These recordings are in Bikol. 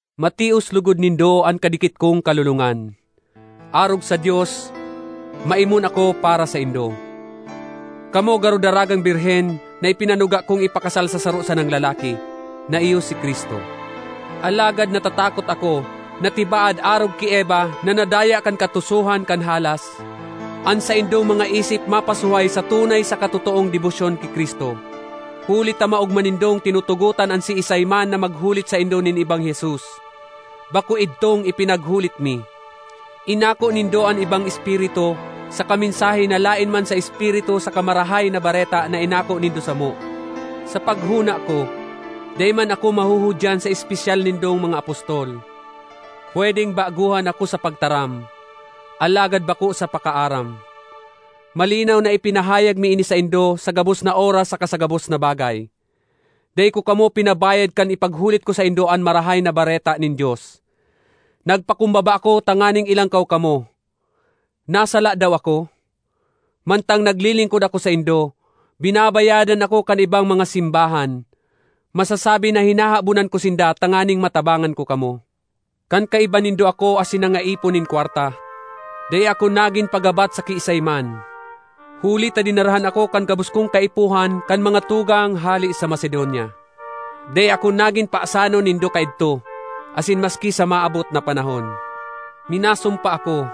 Matios logod nindo an kadikit kong kalolongan. Arog sa Dios, maimon ako para saindo. Kamo garo daragang birhen na ipinanuga kong ipakasal sa saro sanang lalaki, na iyo si Cristo. Alagad natatakot ako na tibaad arog ki Eva na nadaya kan katusohan kan halas, an saindong mga isip mapasuhay sa tunay saka totoong debosyon ki Cristo. Huli ta maogma nindong tinutugotan an siisay man na maghulit saindo nin ibang Jesus, bako idtong ipinaghulit mi; inako nindo an ibang espiritu saka mensahe na laen man sa Espiritu saka sa Marahay na Bareta na inako nindo samo. Sa paghona ko, dai man ako mahuhudyan sa espesyal nindong mga apostol. Pwedeng bagohan ako sa pagtaram, alagad bako sa pakaaram; malinaw na ipinahayag mi ini saindo sa gabos na oras saka sa gabos na bagay. Dai ko kamo pinabayad kan ipaghulit ko saindo an Marahay na Bareta nin Dios; nagpakumbaba ako tanganing ilangkaw kamo. Nasala daw ako? Mantang naglilingkod ako saindo, binabayadan ako kan ibang mga simbahan. Masasabi na hinahabonan ko sinda tanganing matabangan ko kamo. Kan kaiba nindo ako asin nangaipo nin kwarta, dai ako nagin pagabat sa kiisay man, huli ta dinarahan ako kan gabos kong kaipuhan kan mga tugang hale sa Macedonia. Dai ako nagin pasanon nindo kaidto, asin maski sa maabot na panahon. Minasumpa ako,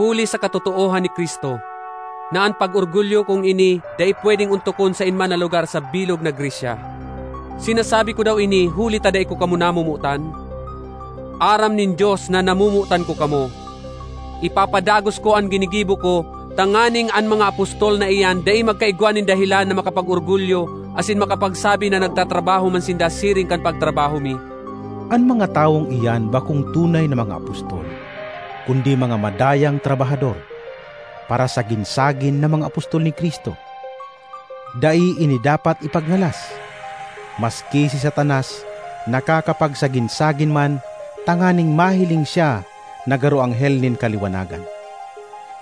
huli sa katotoohan ni Cristo, na an pag-orgulyo kong ini dai pwedeng ontokon saen man na lugar sa bilog na Grecia. Sinasabi ko daw ini huli ta dai ko kamo namomotan? Aram nin Dios na namomotan ko kamo! Ipapadagos ko an ginigibo ko tanganing an mga apostol na iyan dai magkaigwa nin dahelan na makapag-orgulyo asin makapagsabi na nagtatrabaho man sinda siring kan pagtrabaho mi. An mga tawong iyan bakong tunay na mga apostol kundi mga madayang trabahador, parasagin-sagin na mga apostol ni Cristo. Dai ini dapat ipagngalas! Maski si Satanas nakakapagsagin-sagin man tanganing mahiling siya na garo anghel nin kaliwanagan!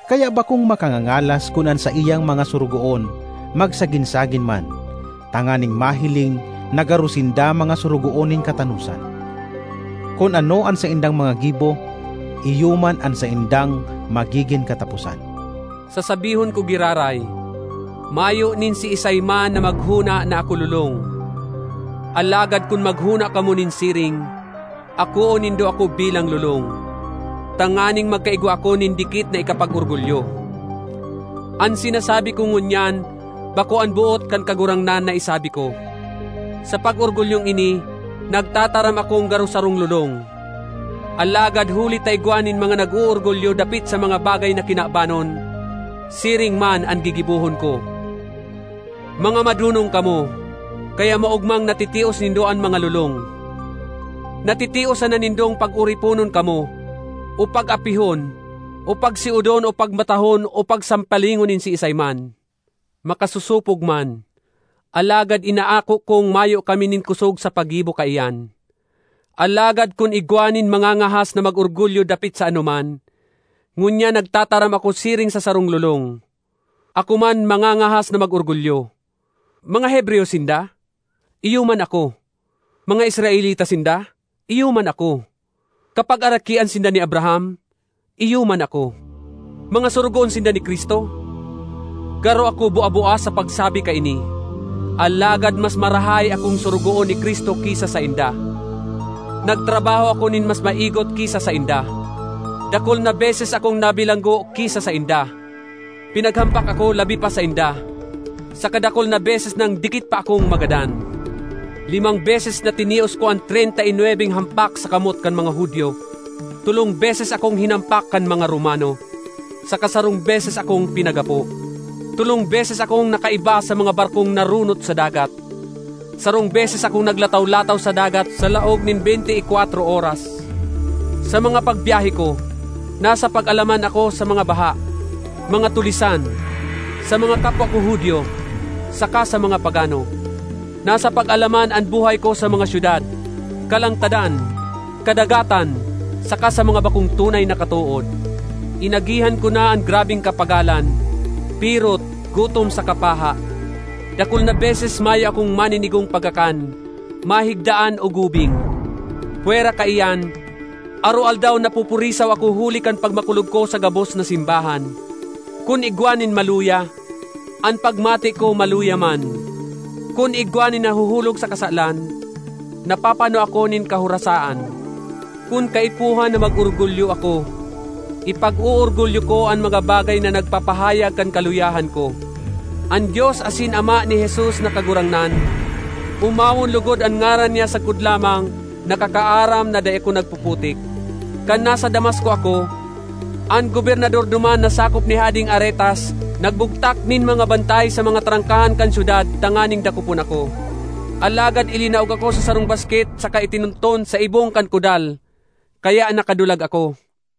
Kaya bakong makangangalas kun an saiyang mga sorogoon magsagin-sagin man tanganing mahiling na garo sinda mga sorogoon nin katanosan. Kun ano an saindang mga gibo iyo man an saindang magigin kataposan. Sasabihon ko giraray: mayo nin siisay man na maghona na ako lolong. Alagad kun maghona kamo nin siring, akoon nindo ako bilang lolong, tanganing magkaigwa ako nin dikit na ikapag-orgulyo. An sinasabi ko ngunyan bako an boot kan Kagurangnan na isabi ko; sa pag-orgulyong ini, nagtataram akong garo sarong lolong. Alagad huli ta igwa nin mga nag-oorgulyo dapit sa mga bagay na kinabanon, siring man an gigibohon ko. Mga madonong kamo, kaya maogmang natitios nindo an mga lolong! Natitios sana nindong pag-oriponon kamo, o pag-apihon o pagsiodon o pagmatahon o pagsampalingon nin siisay man. Makasosopog man, alagad inaako kong mayo kami nin kosog sa paggibo kaiyan! Alagad kun igwa nin mangangahas na mag-orgulyo dapit sa anoman—ngunyan nagtataram ako siring sa sarong lolong—ako man mangangahas na mag-orgulyo. Mga Hebreyo sinda? Iyo man ako. Mga Israelita sinda? Iyo man ako. Kapagarakian sinda ni Abraham? Iyo man ako. Mga sorogoon sinda ni Cristo? Garo ako bua-bua sa pagsabi kaini, alagad mas marahay akong sorogoon ni Cristo ki sa sainda. Nagtrabaho ako nin mas maigot ki sa sainda; dakul na beses akong nabilanggo ki sa sainda, pinaghampak ako labi pa sainda, saka dakul na beses nang dikit pa akong magadan. Limang beses na tinios ko an treynta y nwebeng hampak sa kamot kan mga Judio; tolong beses akong hinampak kan mga Romano, saka sarong beses akong pinaggapo. Tolong beses akong nakaiba sa mga barkong naronot sa dagat; sarong beses akong naglataw-lataw sa dagat sa laog nin beynte y kwatro oras. Sa mga pagbyahe ko, nasa pag-alaman ako sa mga baha, mga tulisan, sa mga kapwa ko Judio saka sa mga pagano. Nasa pag-alaman an buhay ko sa mga syudad, kalangtadan, kadagatan, saka sa mga bakong tunay na katood. Inagihan ko na an grabeng kapagalan, pirot, gutom saka paha; dakul na beses mayo akong maninigong pagkakan, mahigdaan o gubing. Pwera kaiyan, aroaldaw napupurisaw ako huli kan pagmakulog ko sa gabos na simbahan. Kun igwa nin maluya, an pagmate ko maluya man; kun igwa nin nahuhulog sa kasalan, napapano ako nin kahorasaan. Kun kaipuhan na mag-orgulyo ako, ipag-oorgulyo ko an mga bagay na nagpapahayag kan kaluyahan ko. An Dios asin Ama ni Jesus na Kagurangnan—omawon logod an ngaran niya sagkod lamang—nakakaaram na dai ako nagpuputik. Kan nasa Damasco ako, an gobernador duman na sakop ni Hadeng Aretas nagbugtak nin mga bantay sa mga trangkahan kan syudad tanganing dakopon ako. Alagad ilinaog ako sa sarong basket saka itinunton sa ibong kan kudal, kaya nakadulag ako.